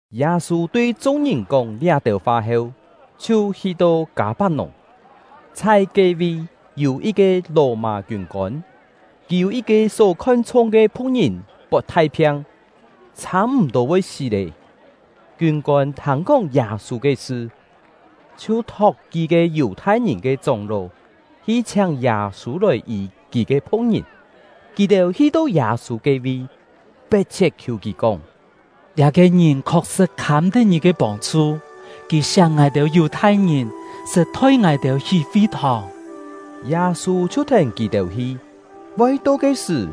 Yâ-sû tui chung-ngìn kóng liá-têu fa heu, chhiu hi-to Kâ-pak-nùng. Chhai ke-vi, yû yit-ke Lò-mâ kiûn-kôn, kì yû yit-ke só khon-chhung ke phu̍k-ngìn pot thai phiang, chhâ-m̀-tô voi sí lé. Kiûn-kôn thâng-kóng Yâ-sû ke sṳ, chhiu thok kí-ke Yù-thai-ngìn ke chóng-ló hi chhiáng Yâ-sû lòi yî kì ke phu̍k-ngìn. Kì-têu hi-to Yâ-sû ke-vi, pet-chhiet khiù kì kóng: “Liá-ke ngìn khok-sṳ̍t khâm-tet ngì ke pông-chhu; kì siak ngài-têu Yù-thai-ngìn, sṳt thoi ngài-têu hí fi-thòng.” Yâ-sû chhiu thèn kì-têu hi. Voi to ke sṳ̀,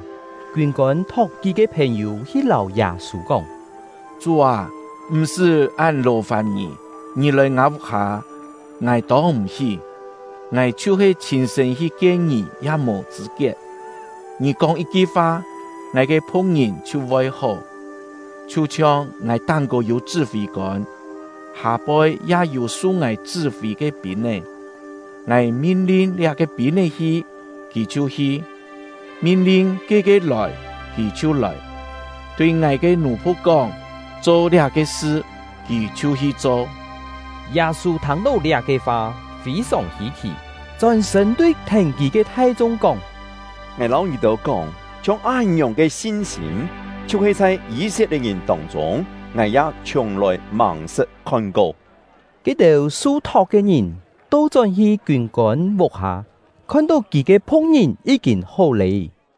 kiûn-kôn thok kí-ke phèn-yû hi lâu Yâ-sû kóng: “Chú â, m̀-sṳ́ án lò-fàn ngì! Ngì lòi ngâ vuk-hâ, ngài tông m̀-hí; ngài chhiu-he chhîn-sṳ̂n hi kien ngì ya mò chṳ̂-kiet. Ngì kóng yit-ki fa, ngài ke phu̍k-ngìn chhiu voi hó. Chhiu-chhiong ngài táng-kô yû chṳ́-fî-kôn, hâ-poi ya yû su ngài chṳ́-fî ke pîn-é. Ngài min-lin liá-ke pîn-é hi, kì chhiu hi; min-lin ke-ke lòi, kì chhiu lòi; tui ngài ke nù-phu̍k kóng ‘Cho liá-ke sṳ’, kì chhiu hi cho.” Yâ-sû thâng-tó liá-ke fa, fî-sòng hî-khì, chón-sṳ̂n tui thèn kì ke thai-chung kóng: “Ngài lâu ngì-têu kóng, chhiong án-ngiòng ke sin-sîm, chhiu-he chhai Yî-set-lie̍t-ngìn tông-chûng, ngài ya chhiùng-lòi màng-sṳt khon-ko!” Ke-têu su-thok ke ngìn to-chón-hi kiûn-kôn vuk-hâ, khon-tó kì ke phu̍k-ngìn yí-kîn hó lé.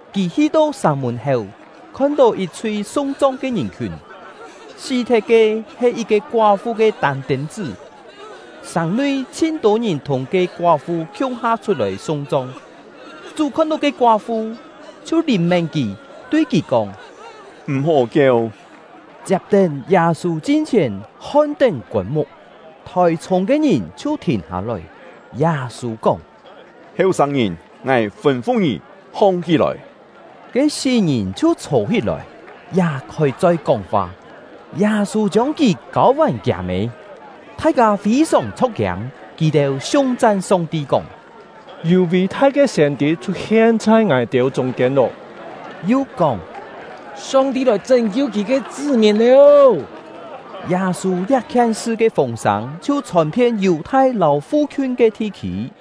Kì hi-to sàng mùn-héu, khon-tó yit-chhui sung-chong ke ngìn-khiùn. Sí-thet-ke he yit-ke koá-fu ke tân-tên-chṳ́; sàng-nui chhin-tô ngìn thùng ke koá-fu khiung-ha chhut-lòi sung-chong. Chú khon-tó ke koá-fu, chhiu lìn-mén kì, tui kì kóng: “M̀-hó kieu!” Chiap-tén, Yâ-sû chin-chhièn hon-tén kôn-muk, thòi-chhûng ke ngìn chhiu thìn hâ-lòi. Yâ-sû kóng: “Heu-sâng-ngìn, ngài fûn-fu ngì, hong-hí-lòi!” Ke sí-ngìn chhiu chhô-hí-lòi, ya khôi-choi kóng-fa. Yâ-sû chiông kì kâu-vàn kiâ-mê. Thai-kâ fî-sòng chho̍k-kiâng; kì-têu siung-chan Song-ti kóng: “Yû ví-thai ke siên-tî chhut-hien chhai ngài-têu chûng-kiên lô!” Yu kóng: “Song-ti lòi chṳ́n-kiu Kì ke chṳ́-mìn lô!” Yâ-sû liá-khien sṳ ke fûng-sâng chhiu chhòn-phien Yù-thai lâu fu-khiun ke thi-khî.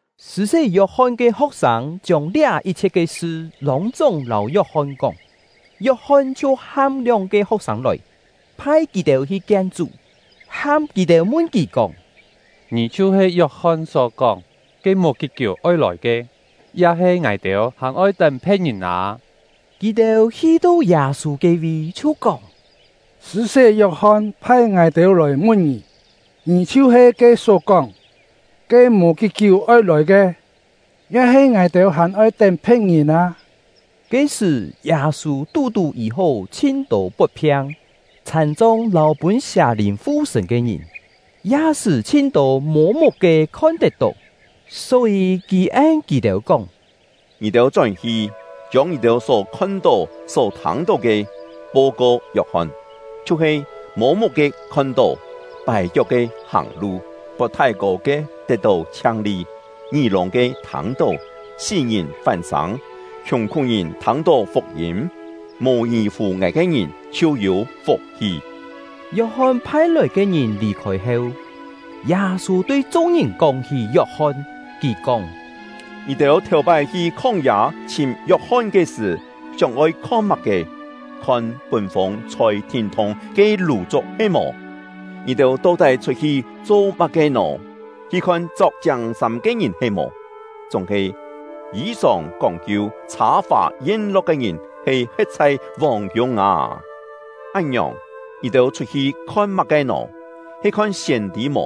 Sṳ̂-sé Yok-hon ke ho̍k-sâng chiông liá yit-chhiet ke sṳ lûng-chúng lâu Yok-hon kóng. Yok-hon chhiu ham lióng-ke ho̍k-sâng lòi, phai kì-têu hi kien Chú, ham kì-têu mun kì, kóng: “Ngì chhiu-he Yok-hon só kóng, ke mò kí-kiú oi lòi ke, ya-he ngài-têu hàn oi tén phe̍t-ngìn â?” Kì-têu hi-to Yâ-sû ke-vi, chhiu kóng: “Sṳ̂-sé Yok-hon phai ngài-têu lòi mun ngì: ‘Ngì chhiu-he kì só kóng, ke mò kí-kiú oi lòi ke, ya-he ngài-têu hàn oi tén phe̍t-ngìn â?’” Ke-sṳ̀, Yâ-sû tú-tú yî-hó chhin-tô pot-phiang, chhàn-chong, lâu pûn sià-lìn fu-sṳ̂n ke ngìn, ya sṳ́ chhin-tô mô-muk-ke khon-tet-tó. Só-yî, kì en kì-têu kóng: “Ngì-têu chón-hi, chiông ngì-têu só khon-tó, só thâng-tó ke, po-ko Yok-hon, chhiu-he: Mô-muk-ke khon-tó, pài-kiok-ke hàng-lu, pot thái-kô ke tet-tó chhiang-li, ngí-lûng-ke thâng-tó, sí-ngìn fán-sâng, khiùng-khú-ngìn thâng-tó fuk-yîm. Mò ngì-fù ngài ke ngìn chhiu yû fuk-hi!” Yok-hon phai-lòi ke ngìn lì-khôi heu, Yâ-sû tui chung-ngìn kóng-hí Yok-hon, kì kóng: “Ngì-têu thèu-pái hi khóng-yâ chhìm Yok-hon ke sṳ̀, sióng-oi khon má-ke? Khon pûn-fûng chhôi thîn-thûng ke lù-chuk he-mò? Ngì-têu to-tái chhut-hi cho má-ke nò? Hi khon chok chiâng-sâm ke ngìn he-mò? Chúng-he yî-sòng kóng-kiu, chhâ-fà yen-lo̍k ke ngìn he he̍t chhai vòng-kiûng â! Án-ngiòng, ngì-têu chhut-hi khon má-ke nò? He khon siên-tî mò?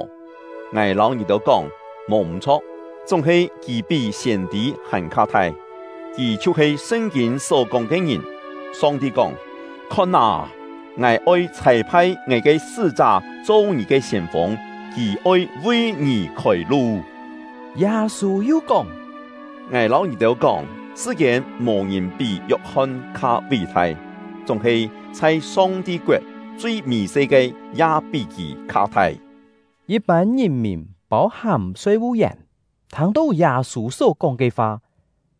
Ngài lâu ngì-têu kóng, mò m̀-chho̍k, chúng-he kì pí siên-tî hàn-kha thai. Kì chhiu-he Sṳn-kîn só-kóng ke ngìn. Song-ti kóng: ‘Khon â, Ngài oi chhâi-phai Ngài ke sṳ́-chá cho ngì ke siên-fûng; kì oi vi ngì khôi-lu.’” Yâ-sû yu kóng: “Ngài lâu ngì-têu kóng, sṳ-kiên mò-ngìn pí Yok-hon kha ví-thai; chúng-he chhai Song-ti koet, chui mì-se ke ya pí kì kha thai!” Yit-pân ngìn-mìn, pâu-hàm soi-vu-yèn, thâng-tó Yâ-sû só-kóng ke fa,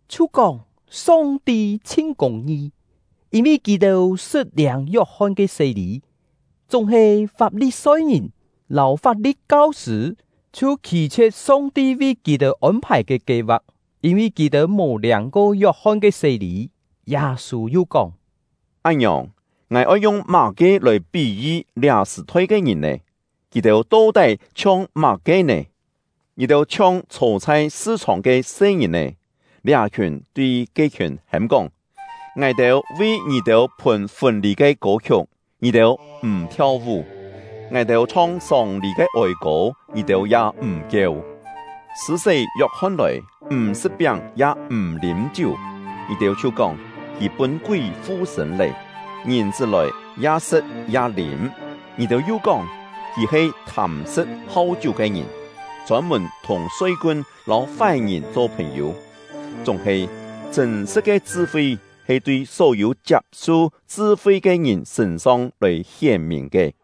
chhiu kóng Song-ti chhin kûng-ngi, yîn-vi kì-têu sṳt liâng Yok-hon ke sé-lî. Chúng-he Fap-li-soi-ngìn lâu Fap-li̍t kau-sṳ̂ chhiu khî-chhie̍t Song-ti vi kì-têu ôn-phài ke kie-va̍k, yîn-vi kì-têu mò liâng-ko Yok-hon ke sé-lî. Yâ-sû yu kóng: “Án-ngiòng, ngài oi yung má-ke lòi pí-yi liá sṳ-thoi ke ngìn nè? Kì-têu to-tái chhiong má-ke nè? Kì-têu chhiong chhô chhai sṳ-chhòng ke se-ngìn-è, liá-khiùn tui ke-khiùn hêm-kóng: ‘Ngài-têu vi ngì-têu phùn fûn-lî ke kô-khiuk, ngì-têu m̀ thiau-vú! Ngài-têu chhong sông-lî ke ôi-kô, ngì-têu ya m̀ kieu!’ Sṳ̂-sé Yok-hon lòi, m̀ sṳ̍t-piáng ya m̀ lîm-chiú, ngì-têu chhiu kóng: ‘Kì pûn kúi fu-sṳ̂n lé!’ Ngìn-chṳ́ lòi, ya sṳ̍t ya lîm, ngì-têu yu kóng: ‘Kì he thâm-sṳ̍t hau-chiú ke ngìn, chôn-mùn thùng soi-kun lâu fái-ngìn cho phèn-yû!’ Chúng-he, chṳ̂n-sṳ̍t ke chṳ-fi he tui só-yû chiap-su chṳ-fi ke ngìn sṳ̂n-song lòi hién-mìn ke.”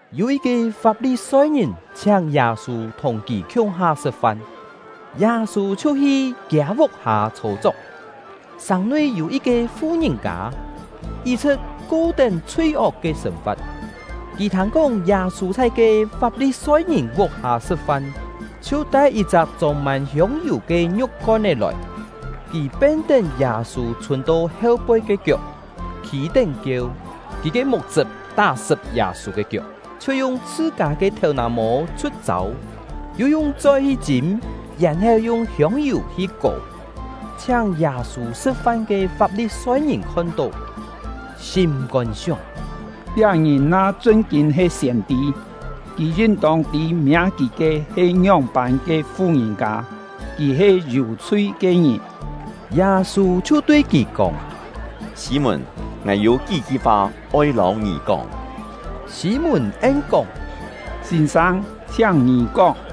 Yû yit-ke Fap-li-soi-ngìn chhiáng Yâ-sû thùng kì khiung-ha sṳ̍t-fan; Yâ-sû chhiu hi kiâ vuk-hâ chhô-chok. Sàng-nui yû yit-ke fu-ngìn-kâ, yit-chhṳ̍t ko-tén chhui-ok ke sên-fa̍t. Kì thâng-kóng Yâ-sû chhai ke Fap-li-soi-ngìn vuk-hâ sṳ̍t-fan, chhiu tai yit-chak chông-mân hiông-yù ke ngiu̍k-kon-é lòi. Kì pen-tén Yâ-sû chhûn-to heu-poi ke kiok, khî-tén kieu. Kì ke muk-chṳp tá-sṳp Yâ-sû ke kiok, chhiu yung chhṳ-kâ ke thèu-nà-mô chhu̍t-châu, yu yung choi hi chîm, yèn-heu yung hiông-yù hi kò. Chhiáng Yâ-sû sṳ̍t-fan ke Fap-li-soi-ngìn khon-tó, sîm-kôn sióng: “Liá ngìn na chṳn-kîn he siên-tî, kì yin-tông tî miâ kì ke he ngióng-pân ke fu-ngìn-kâ; kì he yû-chhui ke ngìn!” Yâ-sû chhiu tui kì kóng: “Sî-mùn, ngài yû kí-ki fa oi lâu ngì kóng.” Sî-mùn en-kóng: “Sîn-sâng, chhiáng ngì kóng.”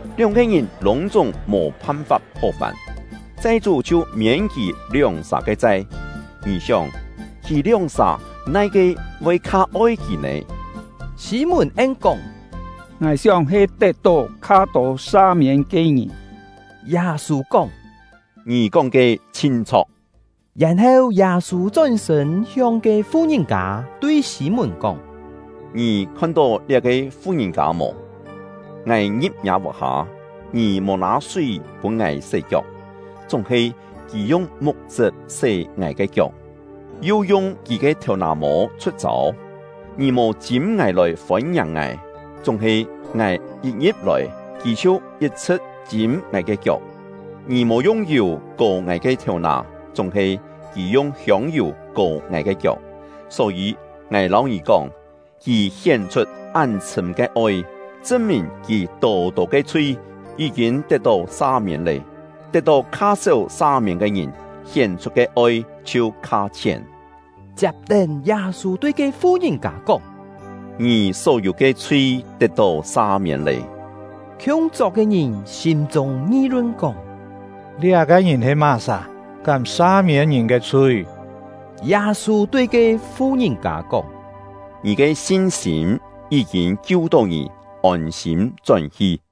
Lióng-ke ngìn lûng-chúng mò phan-fap hó vàn, chai-chú chhiu miên kì lióng-sà ke chai. Ngì sióng, kì lióng-sà nai-ke voi kha oi kì nè?” Sî-mùn en-kóng: “Ngài sióng he tet-tó kha tô sa-miên ke ngìn.” Yâ-sû kóng: “Ngì kóng ke chhin chho̍k.” Yèn-heu Yâ-sû chón-sṳ̂n hiong ke fu-ngìn-kâ, tui Sî-mùn kóng: “Ngì khon-tó liá-ke fu-ngìn-kâ mò? Ngài ngi̍p ngiâ vuk-hâ, ngì mò nâ súi pûn ngài sé-kiok; chúng-he kì yung muk-chṳp sé ngài ke kiok, yu yung kì ke thèu-nà-mô chhu̍t-châu. Ngì mò chîm ngài lòi fôn-ngiàng ngài; chúng-he ngài yit ngi̍p-lòi, kì chhiu yit-chhṳ̍t chîm ngài ke kiok. Ngì mò yung yù kò ngài ke thèu-nà; chúng-he, kì yung hiông-yù kò ngài ke kiok. Só-yî, ngài lâu ngì kóng, kì hién-chhut án-chhṳ̂m ke oi, chṳn-mìn kì tô-tô ke chhui yí-kîn tet-tó sa-miên lé! Tet-tó kha séu sa-miên ke ngìn, hién-chhut ke oi chhiu kha chhién.” Chiap-tén, Yâ-sû tui ke fu-ngìn-kâ kóng: “Ngì só-yû ke chhui tet-tó sa-miên lé.” Khiung-chok ke ngìn sîm-chûng ngi-lun kóng: “Liá-ke ngìn he má-sà? Kám sa-miên ngìn ke chhui!” Yâ-sû tui ke fu-ngìn-kâ kóng: “Ngì ke sin-sîm yí-kîn kiu-tó ngì; ôn-sîm chón-hi!”